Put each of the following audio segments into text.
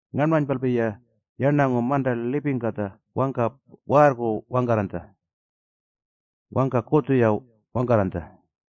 Ngarnmanypalpi-ya yarnangu manta lipingkatja wangka waarrku wangkarranytja. Wangka kutjurtu-ya wangkarranytja.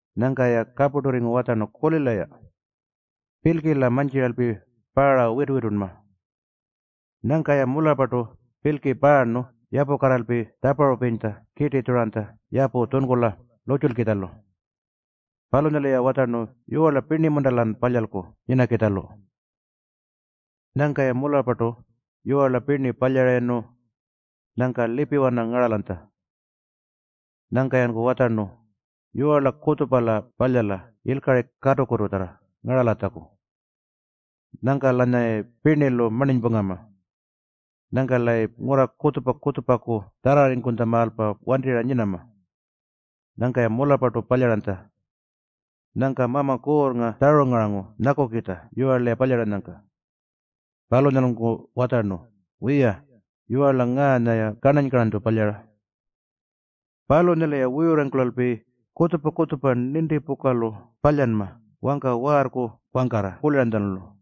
Nyangka-ya kapurturringu watjarnu, “Kulila-ya. Pilki-la mantjiralpi paara witu-witunma.” Nyangka-ya mularrpartu pilki paarnu yapukarraralpi tjaparupirinytja kirtitjuranytja yapu tjunkula lurrtjulkitjalu. Palunyalu-ya watjarnu, “Yiwarla pirni-munta-lan palyalku nyinakitjalu?” Nyangka-ya mularrpartu yiwarla pirni palyarayirnu, nyangka lipiwana ngaralanytja. Nyangka-yanku watjarnu, “Yiwarla kutjupa-la palyala yilkari katukututjarra ngaralatjaku. Nyangka-lanyayayi pirnilu marninypungama. Nyangka-layi ngurra kutjupa-kutjupaku tjarrarringkutjamaalpa wantirra nyinama.” Nyangka-ya mularrpartu palyaranytja. Nyangka Mama Kuurrnga tjarungarangu nyakukitja yiwarla-ya palyaranyangka. Palunyalunku watjarnu, “Wiya, yiwarla ngaanya-ya karnany-karnanytju palyara. Palunyalu-ya wuyurrarringkulalpi kutjupa-kutjupa nintipukalu palyanma wangka waarrku wangkarra kuliranytjalu.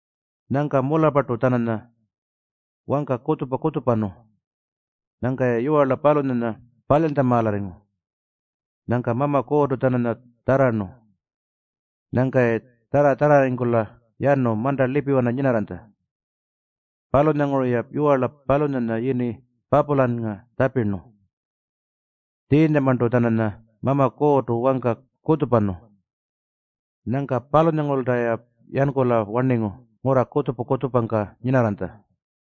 Nyangka mularrpartu-tjananya wangka kutjupa-kutjupanu. Nyangka-ya yiwarla palunyanya palyantjamaalarringu. Nyangka Mama Kuurrtu-tjananya tjarrarnu. Nyangka-ya tjarra-tjarrarringkula yanu manta lipiwana nyinarranytja. Palunyanguru-ya yiwarla palunyanya yini Papulannga tjapirnu. Tjiinyamarntu-tjananya Mama Kuurrtu wangka kutjupa-kutjupanu. Nyangka palunyangurulta-ya yankula-warningu ngurra kutjupa-kutjupangka nyinarranytja.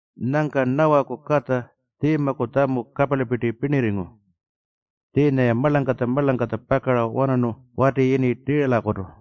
Nyangka Nawaku katja Tjiimaku tjamu kaparlipirti pirnirringu. Tjiinya-ya marlangkatja-marlangkatja pakara-wanarnu wati yini Tiiralakutu.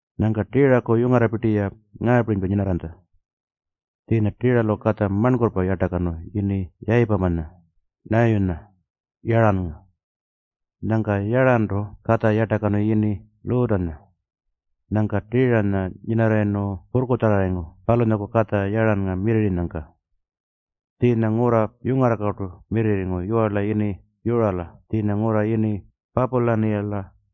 Nyangka Tiiraku yungarrapirti-ya ngaapirinypa nyinarranytja. Tjiinya Tiiralu katja marnkurrpa yartakanu yini Yayipamanya, Nayiyunya, Yarrannga. Nyangka Yarrantu katja yartakanu yini Luutanya. Nyangka Tiiranya nyinarrayirnu purrkutjarrarringu palunyaku katja Yarrannga mirrirrinyangka. Tjiinya ngurra yungarrangkartu mirrirringu yiwarla yini Yurala tjiinya ngurra yini Papulaniyala.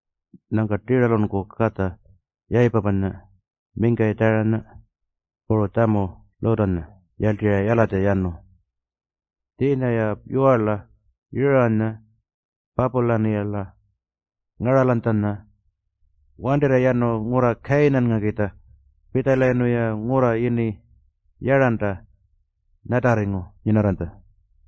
Nyangka Tiiralunku katja Yayipamanya, mingkayi Tjarayinya, puru tjamu Luutanya yarltirra yalatja yanu. Tjiinya-ya yiwarla Yuranya Papulaniyala ngaralanytjanya wantirra yanu ngurra Kayinanngakitja. Pitjalayirnu-ya ngurra yini Yarranta nyatarringu nyinarranytja.